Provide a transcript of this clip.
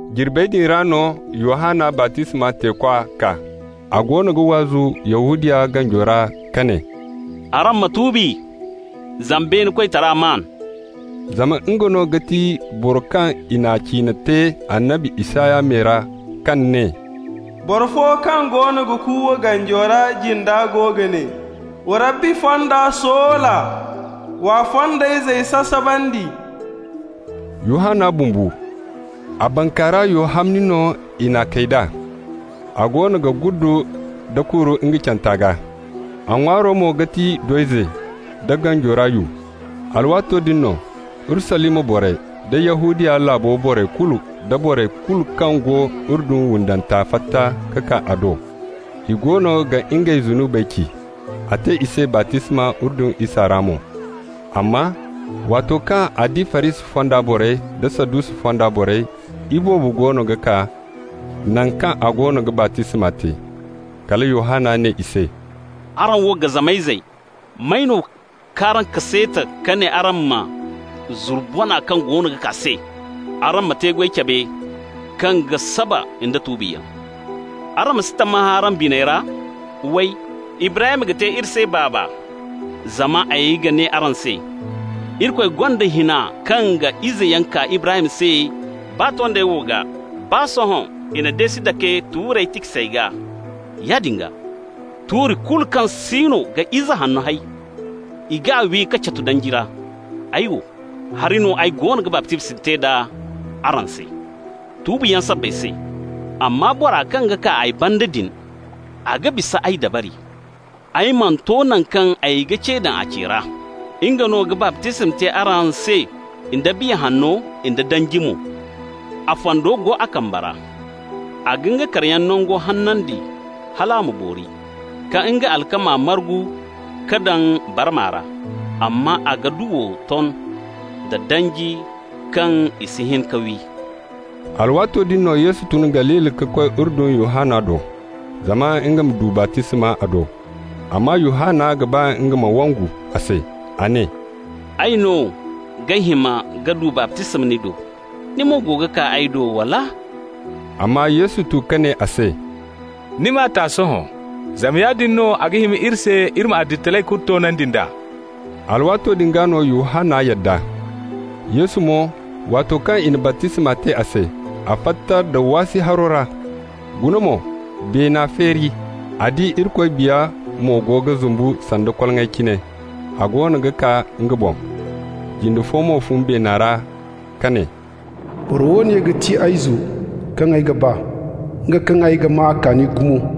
Jirbey din ra no Yohanna baptisma teekwa kaa. A goono ga waazu Yahudiya ganjo ra, ka ne: «Araŋ ma tuubi, zama beene koytara maan. Zama nga no ga ti boro kaŋ i n'a ciine te annabi Isaya me ra, kaŋ ne: ‹Boro fo kaŋ goono ga kuuwa ganjo ra jinda go ga ne: Wa Rabbi fonda soola, w'a fondayzey sasabandi.›» Yohanna bumbo, a bankaara yo hamni no i n'a kay d'a. A goono ga guddu nda kuuru nga canta gaa. A ŋwaaro mo ga ti do-ize da ganjo ra yu. Alwaato din no Urusalima borey da Yahudiya laabo borey kulu da borey kulu kaŋ go Urdun windanta fatta ka kaa a do. I goono ga ngey zunubey ci. A te i se baptisma Urdun isa ra mo. Amma waato kaŋ a di Farisi fonda borey da Sadusi fonda borey iboobo goono ga kaa naŋ kaŋ a goono ga baptisma te, kala Yohanna ne i se: «Araŋ wo gazama izey! May no k'araŋ kaseeti ka ne araŋ ma zuru bona kaŋ goono ga kaa se? Araŋ ma te-goy cabe kaŋ ga saba nda tuubiyaŋ. Araŋ ma si tammahã araŋ biney ra, way: Ibrahim ga te iri se baaba. Zama ay ga ne araŋ se: Irikoy gonda hina kaŋ ga izeyaŋ kaa Ibrahim se baa tondey wo gaa. Baa sohõ i na deesi dake tuurey tiksey gaa. Yaadin gaa, tuuri kulu kaŋ siino ga ize hanno hay, i g'a wi k'a catu danji ra. Ay wo, hari no ay goono ga baptisma te d'a araŋ se, tuubiyaŋ sabbay se. Amma bora kaŋ ga kaa ay banda din, a ga bisa ay dabari. Ay mana to naŋ kaŋ ay ga ce daŋ a ce ra. Nga no ga baptisma te araŋ se da Biya Hanno da danji mo. A fando go a kambe ra. A ga nga karayaŋ nango hanandi hal a ma boori, ka nga alkama margu ka daŋ barma ra, amma a ga duwo ton da danji kaŋ i si hin ka wi.» Alwaato din Yesu tun Galili ka koy Urdun Yohanna do, zama nga ma du baptisma a do. Amma Yohanna ga ba nga ma wangu a se. A ne: «Ay no ga hima ay ma du baptisma ni do, ni mo go ga kaa ay do, wala?» Amma Yesu tu ka ne a se: «Ni m'a ta sohõ. Zama yaadin no a ga hima iri se iri ma adilitaray kulu toonandi nd'a.» Alwaato din gaa no Yohanna yadda. Yesu mo, waato kaŋ i na baptisma te a se, a fatta nda waasi haro ra. Guna mo, beena feeri, a di Irikoy Biya mo go ga zumbu sanda koloŋay cine, a goono ga kaa nga boŋ. Jinde fo mo fun beena ra ka ne: «Boro woone ga ti ay Izo kaŋ ay ga ba, nga kaŋ ay ga maa a kaani gumo.»